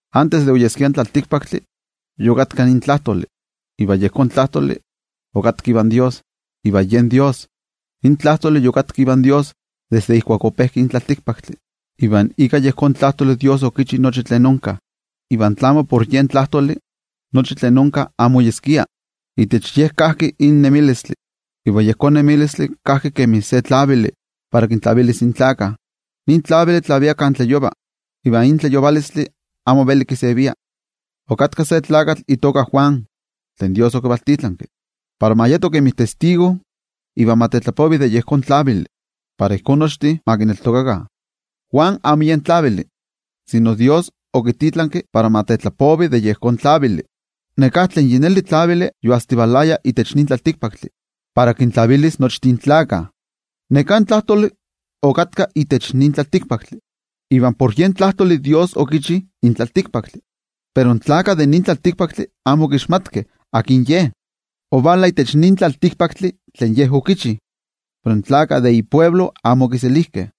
Antes de oyeskia in tlaltikpaktli, yokatka in Tlajtoli, iva yejón Tlajtoli okatka ivan Dios, iva yen Dios. In Tlajtoli okatka ivan Dios desde ijkuak ope in tlaltikpaktli. Iva ika yejón Tlajtoli, Dios okichi nochi tlen onka. Iva tlamo por yejón Tlajtoli, nochi tlen onka amo oyeskia. Itech yejón Tlajtoli kajki in nemilistli, iva in nemilistli yen tlavili para kintlavilis in tlaltikpaktlakah. Nin tlavili tlavia kan tlayova, iva in tlayovalotl amo veli kisevia. Okatka se tlakatl itoka Juan, tlen Dios okivaltitlanki, para ma yeto kemi testigo iva ma tetlapovi de yejón tlavili, para ijkó nochtin ma kineltokakah. Juan amo yen tlavili, sino Dios okititlanki para ma tetlapovi de yejón tlavili. Neká tlen yi neli tlavili yoajsitivalaya itech nin tlaltikpaktli para kintlavilis nochtin tlaltikpaktlakah. Neká Tlajtoli yokatka itech nin tlaltikpaktli. Iva por yen Tlajtoli Dios okichi in tlaltikpaktli, pero in tlaltikpaktlakah amo okixmatkeh akin Ye. Ovala itech nin tlaltikpaktli tlen Ye okichi, pero tlen iaxkavah amo okiselijkeh.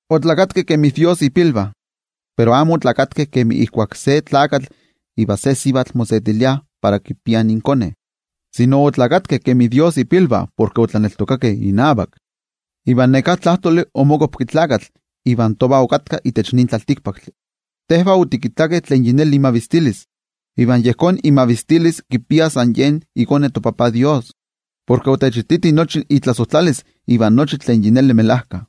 Oneskeh kemi Dios ipilvah, pero amo oneskeh kemi ijkuak se tlakatl ivan se sivatl mosetiliah para kipiah inkone, sino oneskeh kemi Dios ipilvah porke otlaneltokakeh inavak. Iva neká Tlajtoli omokuapki tlakatl iva tovah okatka itech nin tlaltikpaktli. Iva otikittakeh imavistilis, iva yejón mavistilistli kipia san yen iKone toTajtzin Dios, porke otechititi nochi itlasojtlalis iva nochi tlen yi neli melajka.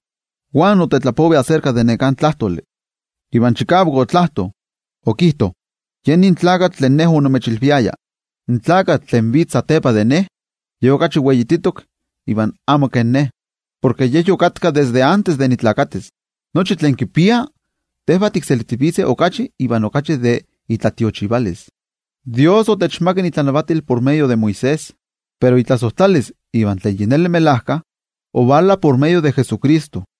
Juan otetlapovi aserka de neká Tlajtoli. Iva chikavak okijtovaya: —Ye nin tlakatl tlen ne onimechilviaya: “In tlakatl tlen vitz satepa de ne, Ye okachi weititok iva amo kemin ne, porke Ye yokatka desde antes de ne ninesis.” De nochi tlen kipia, tinochtin tikselijtivitzeh okachi iva okachi de itlatiochivalis. Dios otechmakak itlanavatil por medio de Moisés. Pero itlasojtlalis iva tlen melajkayotl, ovala por medio de Jesucristo.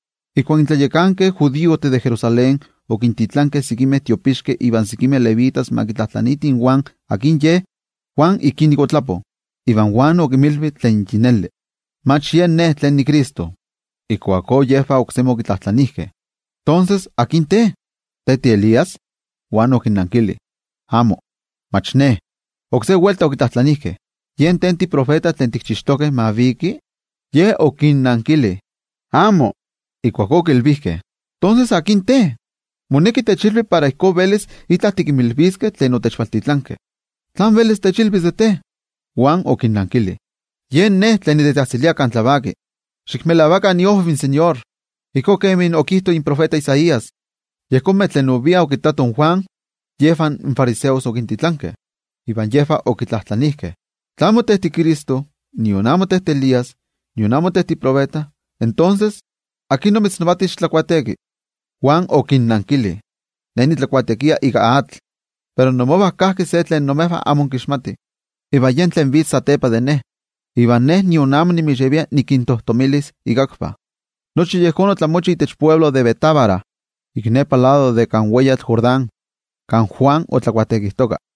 In tlayakankeh judiojtih de Jerusalén okintitlankeh sekimeh tiopixkeh iva sekimeh levitas para ma kitlajtlaniitih in Juan akin ye. Iva Juan okinmilvi tlen yi neli: —Mach ne niCristo. Ijkuakó yejvah oksemi okitlajtlanijkeh: —Tonses, ¿akin te? ¿Te tiElías? Juan okinnankili: —Amo, mach ne. Oksé welta okitlajtlanijkeh: —¿Te tiprofeta tlen tikchixtokeh ma viki? Ye okinnankili: —Amo. Ijkuakó okilvijkeh: —Tonses, ¿akin te? Moneki techilvi para ijkó velis itla tikinmilviskeh tlen otechvaltitlankeh. ¿Tlán velis techilvis de te? Juan okinnankili: —Yen ne tlen nitetzajtzilia chikavak kan tlavaki: “Xikmelavakah iojviv in toTeko” —ijkó kemi okijto in tiotenejmachti Isaías. Yejonmeh tlen oviah okittatoh in Juan, yejvah in fariseos okintitlankeh, iva okitlajtlanijkeh: —Tla amo te tiCristo, nion amo te tiElías, nion amo te tiprofeta, tonses, ¿akin omitznavati xitlabautisaro? Juan okinnankili: —Ne nitlabautisarova ika atl, pero imovah kajki se tlen imejvah amo inkixmatih, iva yen tlen vitz satepa de ne. Iva ne nion amo notech povi para nikintojtomilis ikakvah. Nochi nin tlamantli otlamochi itech altepetl Betábara, ik nepa lado de kan weyatl Jordán, kan Juan otlabautisarojtoka.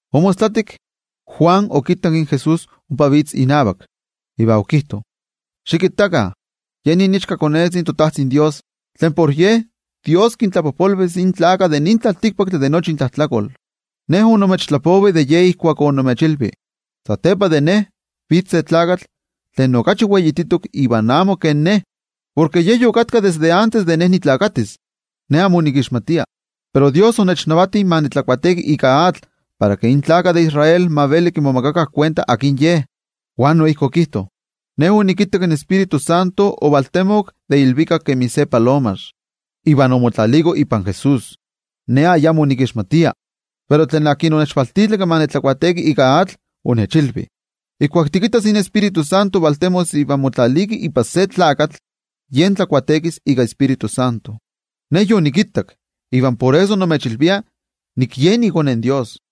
Omostlatik, Juan okittak in Jesús ompa vitz inavak, iva okijto: —Xikittakah, yen nin iichkakone in Dios, tlen kinkixtilia intlajtlakol in tlaltikpaktlakah. Ne onimechtlapovi de Ye ijkuak onimechilvi: “Satepa de ne vitz se tlakatl tlen okachi weititok iva amo kemin ne, porke Ye yokatka desde antes de ne ninesis.” Ne amo onikixmatia, pero Dios onechnavati ma nitlabautisaro ika atl para ke in gentejtih de Israel ma veli kimomakakah kuenta akin Ye. Juan noijki okijto: —Ne onikittak in Tioijyotzintli ovaltemok de ilvikak kemi se palomax, iva omotlaliko ipan Jesús. Ne ayamo onikixmatia. Pero tlen onechvaltitlanki ma nitlabautisaro ika atl, onechilvi: “Ijkuak tikittas in Tioijyotzintli valtemos iva motlaliki ipan se tlakatl, yen tlabautisaros ika Tioijyotzintli.” Ne yonikittak, iva por eso nimechilvia nik yen iKone in Dios.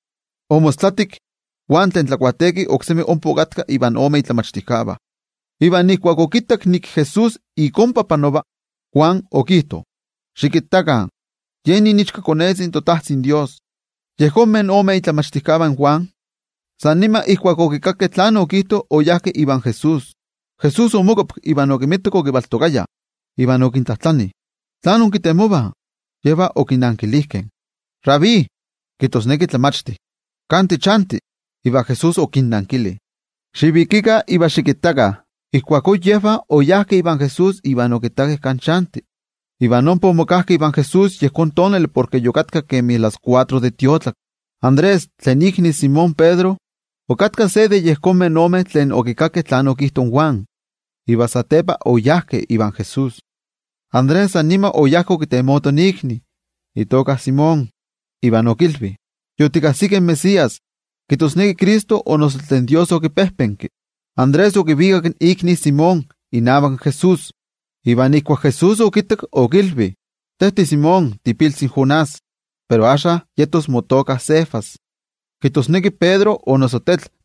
Omostlatik, Juan tlen tlabautisaro oksemi ompa okatka invan ome tlen okinmachtiaya. Iva ijkuak okittak ke Jesús ik ompa panova, Juan okijto: —Xikittakah, yen nin iichkakone in Dios. Yejonmeh ome momachtijkeh de Juan, san nima ijkuak okikakkeh tlen okijto, oyajkeh ivan Jesús. Jesús omokuapki iva okinmitak okivaltokayah, iva okintlajtlani: —¿Tlán inkinekih? Yejvah okinankilijkeh: —Rabí —kijtosneki Tlamachti—, ¿kan tichanti? Iva Jesús okinnankili: —Xivikikah iva xikittakah. Tos oyajkeh ivan Jesús iva okittakeh kan chanti, iva ompa omokajkeh ivan Jesús yejón tonali porke yokatka kemi las kuatro de tiotlaki. Andrés, tlen ikni in Simón Pedro, okatka se de yejonmeh tlen okikakkeh tlen okijto in Juan iva satepa okiseguirojkeh in Jesús. Andrés san nima oyá okitemoto ikni Simón, iva okilvi: —Yotikajsikeh in Mesías —kijtosneki Cristo o noso tlen Dios okipejpenki. Andrés okivikak ikni Simón inavak Jesús, iva ijkuak Jesús okittak okilvi: —Te tiSimón tiipiltzi in Jonás, pero axka motoka yetos Cefas —kijtosneki Pedro o noso Tetl.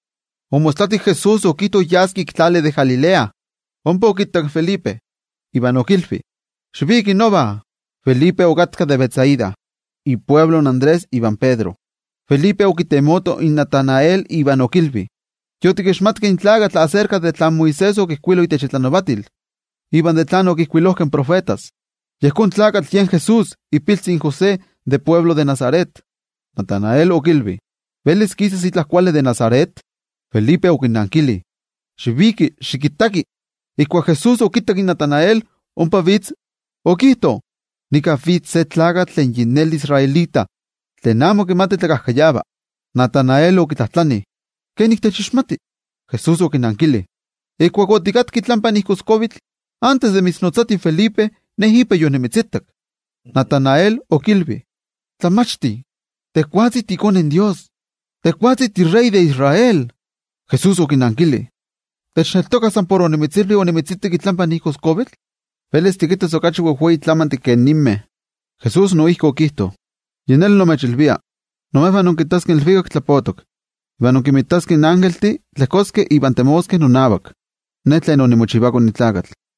Omostlatik Jesús okijto yas ik tlali de Galilea. Ompa okittak in Felipe, iva okilvi: —Xiviki nova. Felipe okatka de Betsaida, ialtepe in Andrés ivan Pedro. Felipe okitemoto in Natanael iva okilvi: —Yotikajsikeh in tlakatl tlen Moisés okijkuilo itech itlanavatil, iva tlen okijkuilojkeh in tiotenejmachtijkeh. Yejón tlakatl yen Jesús ipiltzi in José de altepetl Nazaret. Natanael okilvi: —¿Velis kisas itla kuali de Nazaret? Felipe okinankili: —Xiviki, xikittaki. Ijkuak Jesús okittak in Natanael ompa vitz, okijto: —Nika vitz se tlakatl tlen yi neli israelita, tlen amo kimati tlakajkayava. Natanael okitlajtlani: —¿Kenik techixmati? Jesús okinankili: —Ijkuak otikatka itlampa igoskuavitl, antes de mitznotzati in Felipe, Ne ipa yonimitzitak. Natanael okilvi: —¡Tlamachti, tejwatzi tiiKone in Dios! ¡Tejwatzi tiwei tlanavati de Israel! Jesús okinankili: —¿Techneltoka san por onimitzilvi onimitzitak itlampa igoskuavitl? Velis tikinmitas okachi wejwei tlamantih ke ninmeh. Jesús noijki okijto: —Yi neli nimechilvia, imejvah inkittaskeh in ilvikak tlapotok, iva inkinmitaskeh in ilvikaktlatitlaniltih tlejkoskeh iva temoskeh ipan iKone in Tlakatl.